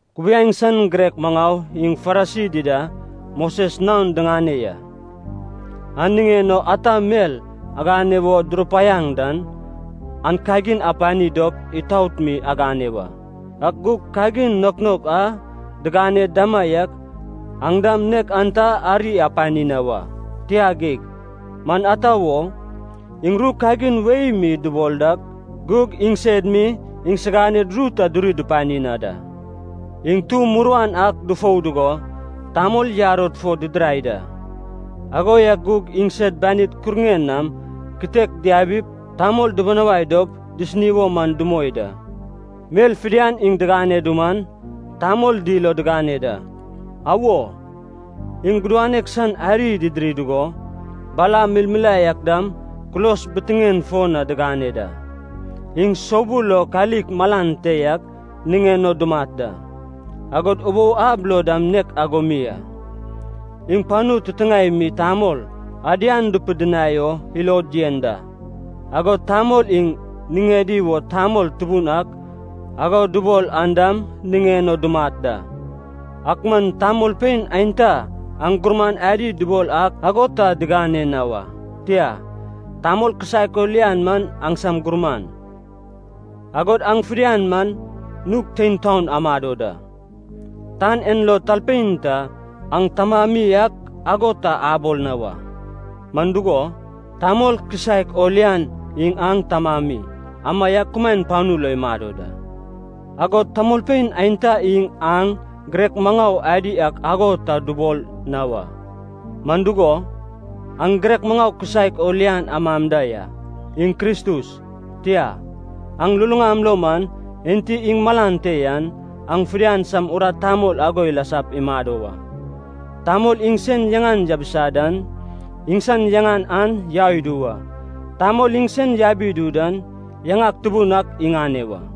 “Kubiaeŋ san girek maŋau iŋ Farisi dida Moses naon diŋane ya. An niŋen o ata mel agane wo durupaiaŋ dan an kagin apani dop itaot mi agane wa. Ak gug kagin naok naok a digane damaiak aŋ dam nek an ta ari apani na wa. Tia geig, man ata wo? Iŋ ru kagin wei mi dubol dak, gug iŋsed mi iŋsiganed ru ta duri dupani na da. Iŋ tu muruan ak dufou dugo, tamol yarod fo didirai da, ago yak gug iŋsed banid kuruŋen nam kitek diabip tamol dubunawai dop disini wo man dumoi da. Mel fidian iŋ digane duman, tamol dil o digane da. Awo, iŋ gudanek san ariy didiri dugo, bala milmilae ak dam kulos bitiŋen fo na digane da. Iŋ soubul lo kalik malan te yak niŋen o dumat da, agod ubou ab lo dam nek ago mi a. Iŋ panu titiŋae mi tamol ‘adian’ dupidinai o ilod yen da, agod tamol iŋ niŋedi wo ‘tamol tubun ak’ ago dubol an dam niŋen o dumat da. Ak man, tamolpein aenta aŋ gurman adi dubol ak ago ta digane na wa. Tia, tamol kisaek o lian man aŋsam gurman, agod aŋ fidian man nug tein taon amado da. Tan en lo talpein ta aŋ tamami ak ago ta abol na wa. Man dugo, Tamol kisaek o lian iŋ aŋ tamami, amaiak kumaen panu lo imado da. Agod tamolpein aenta iŋ aŋ girek maŋau adi ak ago ta dubol na wa, man dugo, aŋ girek maŋau kisaek o lian am da ya, iŋ Kristus. Tia, aŋ luluŋam lo man, enti iŋ malan te yan, aŋ fidian sam urat tamol ago ilasap imado wa. Tamol iŋ sen yaŋan yabisa dan, iŋsan yaŋan an yau idu wa. Tamol iŋ sen yabi idu dan, yaŋak tubun ak iŋane wa.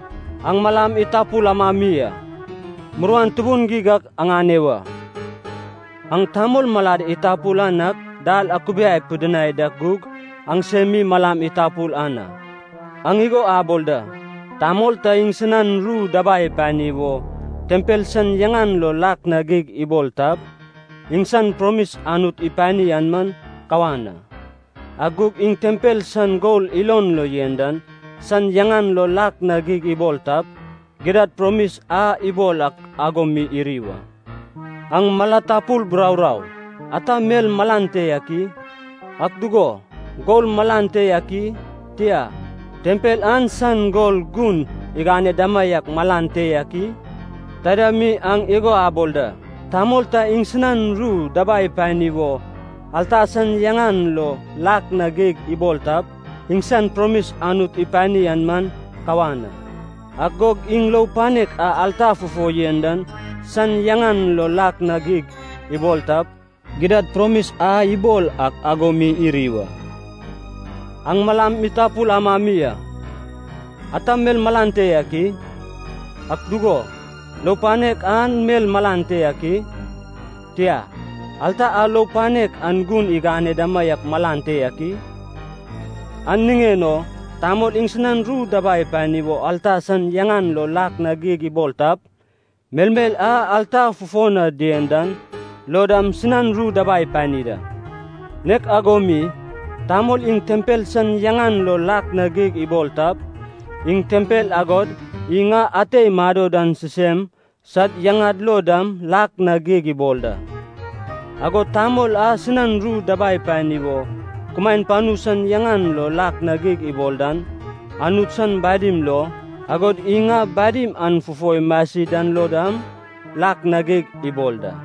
“Aŋ malam itapul amami a, muruan tubun geig ak aŋane wa. Aŋ tamol malad itapul an ak dal akubiai pidinai dak gug aŋsem mi malam itapul an a. Aŋ igo abol da, ‘Tamol ta iŋsinan ru dabai ipani wo, tempel san yaŋan lo lak na geig ibol tap, iŋsan promis Anut ipani an man kawan a. Ak gug iŋ tempel san gol ilon lo yen dan san yaŋan lo lak na geig ibol tap, gidad promis a ibol ak ago mi iri wa.’ Aŋ mala tapul buraurau! Ata mel malan te yak i? Ak dugo, gol malan te yak i? Tia, tempel an san gol gun igane damaiak malan te yak i? Taida mi aŋ igo abol da, ‘Tamol ta iŋsinan ru dabai ipani wo, alta san yaŋan lo lak na geig ibol tap, iŋsan promis Anut ipani an man kawan a. Ak gug iŋ lou panek a alta fufo yen dan san yaŋan lo lak na geig ibol tap, gidad promis a ibol ak ago mi iri wa.’ Aŋ malam itapul amami a! Ata mel malan te yak i? Ak dugo, lou panek an malan te yak i? Tia, alta a lou panek an gun igane damaiak malan te yak i? An niŋen o tamol iŋsinan ru dabai ipani wo alta san yaŋan lo lak na geig ibol tap, melmel a alta fufo na dien dan lo dam sinan ru dabai ipani da. Nek ago mi, tamol iŋ tempel san yaŋan lo lak na geig ibol tap, iŋ tempel agod Iŋ a ate imado dan sisem sad yaŋad lo dam lak na geig ibol da. Agod tamol a sinan ru dabai ipani wo kumaen panu san yaŋan lo lak na geig ibol dan, Anut san badim lo, agod Iŋ a badim an fufo imasi dan lo dam, lak na geig ibol da.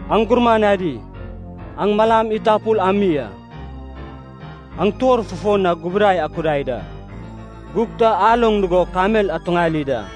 Aŋ gurman adi, aŋ malam itapul ami a! Aŋ tuor fufo na gubudai akudai da, gug ta aloŋ dugo kamel atuŋali da!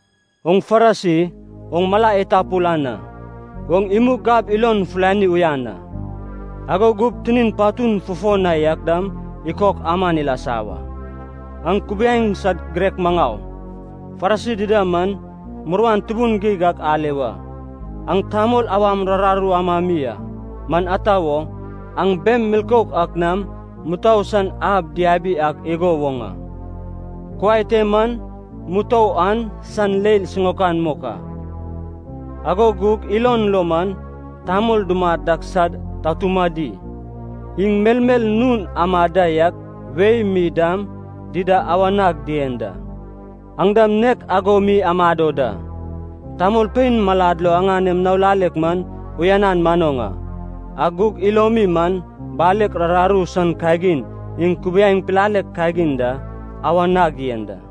Oŋ Farisi, oŋ mala itapul an a! Oŋ imug gab ilon fulani uyan a, ago gup tinin patun fufo na yak dam ikok aman ilasa wa. “Aŋ kubiaeŋ san girek maŋau, Farisi dida man, muruan tubun geig ak ale wa. Aŋ tamol awam rararu amam mi a! Man ata wo? Aŋ bem milkouk ak nam mutou san ab diabi ak igo woŋ a. Kuai te man mutou an san leil siŋaokan mok a, ago gug ilon lo man tamol dumat ak sad tatumadi, iŋ melmel nun amad da yak wei mi dam dida awa nag dien da. Aŋ dam nek ago mi amado da. Tamolpein malad lo aŋanem nao lalek man uyanan manoŋ a, ak gug ilomi man, balek rararu san kagin iŋ kubiaeŋ pilalek kagin da awa nag yen da.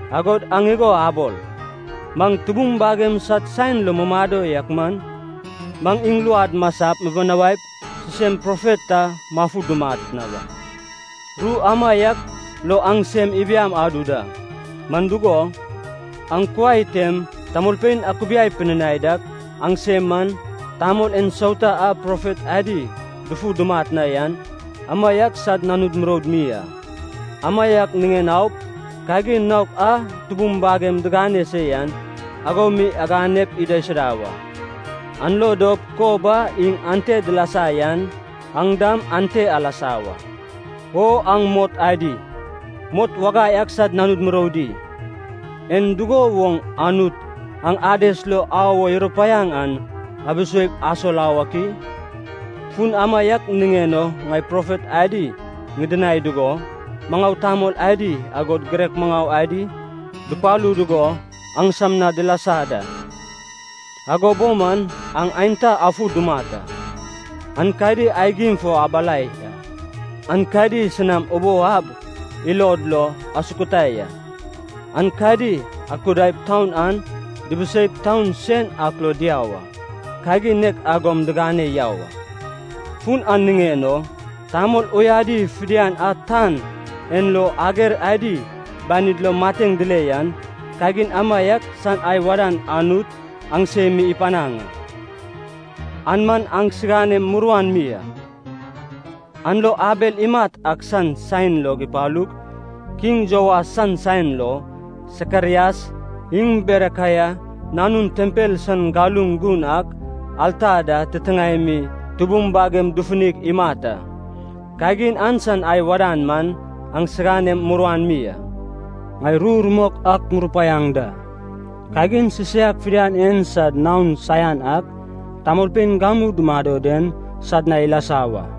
Agod aŋ igo abol, ‘Maŋ tubum bagem sad saen lo mumado yak man, maŋ iŋ luad masap mibinawaip sisem profet ta mafu dumat na wa.’ Ru amaiak lo aŋ sem ibiaŋ adu da, man dugo, aŋ kuai tem tamolpein akubiai pidinai dak aŋsem man, tamol ensauta a profet adi dufu dumat na yan, amaiak sad nanud muroud mi a. Amaiak niŋen aup, kagin naok a tubum bagem digane se yan, ago mi aganep idaisuda wa. An lo dop kob a iŋ ante dilasa yan aŋ dam ante alasa wa! “O aŋ mot adi, mot wagai ak sad nanud muroudi! En dugo woŋ Anut aŋ Ades lo au o irupaiaŋ an abiseip asol au ak i? Fun amaiak niŋen o ŋai profet adi ŋidinai dugo, maŋau tamol adi, agod girek maŋau adi, dupalu dugo aŋsam na dilasa da. Ago bo man aŋ aenta afu dumat a, aenkadi aigim fo abalai a, aenkadi sinam ubou ab ilod lo asukutai a. Aenkadi akudaip taun an dibiseip taun sen ak lo diau a, kagin nek agom digane yau a. Fun an niŋen o, tamol uyadi fidian a tan en lo ager adi banid lo mateŋ dile yan, kagin amaiak san ai wadan Anut aŋsem mi ipanaŋ a. An man aŋsinam muruan mi a. An lo Abel imat ak san saen log ipalug kiŋ Joas san saen lo, Sakarias iŋ Berekaia nanun tempel san galuŋ gun ak, alta da titiŋae mi tubum bagemi dufunig imat a, kagin an san ai wadan man aŋsiganem muruan mi a. Ŋai ru rumok ak ŋurupaiaŋ da, kagin sisaiak fidian en sad naon saian ak tamolpein gamu dumado den sad na ilasa wa.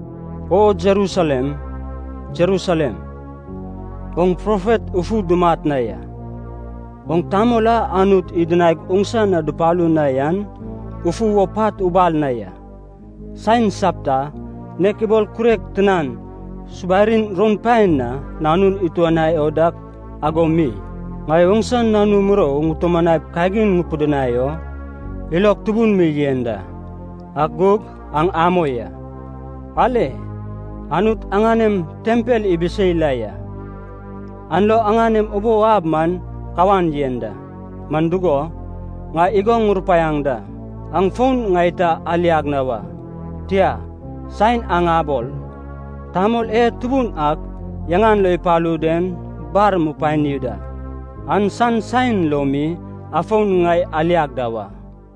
“O Jerusalem, Jerusalem, oŋ profet ufu dumat na ya, oŋ tamol a Anut idinaig oŋsa na dupalu na yan ufu wo pat ubal na ya! Saen sapta, nek ibol kurek tinan subarin roun paen na nanun ituanai o dak ago mi, ŋai oŋsa nanu murou ŋutumanaip kagin ŋupidinai o, ilog tubun mi yen da. Ak gug aŋ amoi a. Ale, Anut aŋanem tempel ibisei la ya, an lo aŋanem ubou ab man kawan yen da. Man dugo, ŋai igo ŋurupaiaŋ da, aŋ fon ŋai ta aliag na wa. Tia, saen aŋ abol, ‘Tamol e Tubun ak yaŋan lo ipalu den bar mupani da,’ an san saen lo mi afon ŋai aliag da wa.”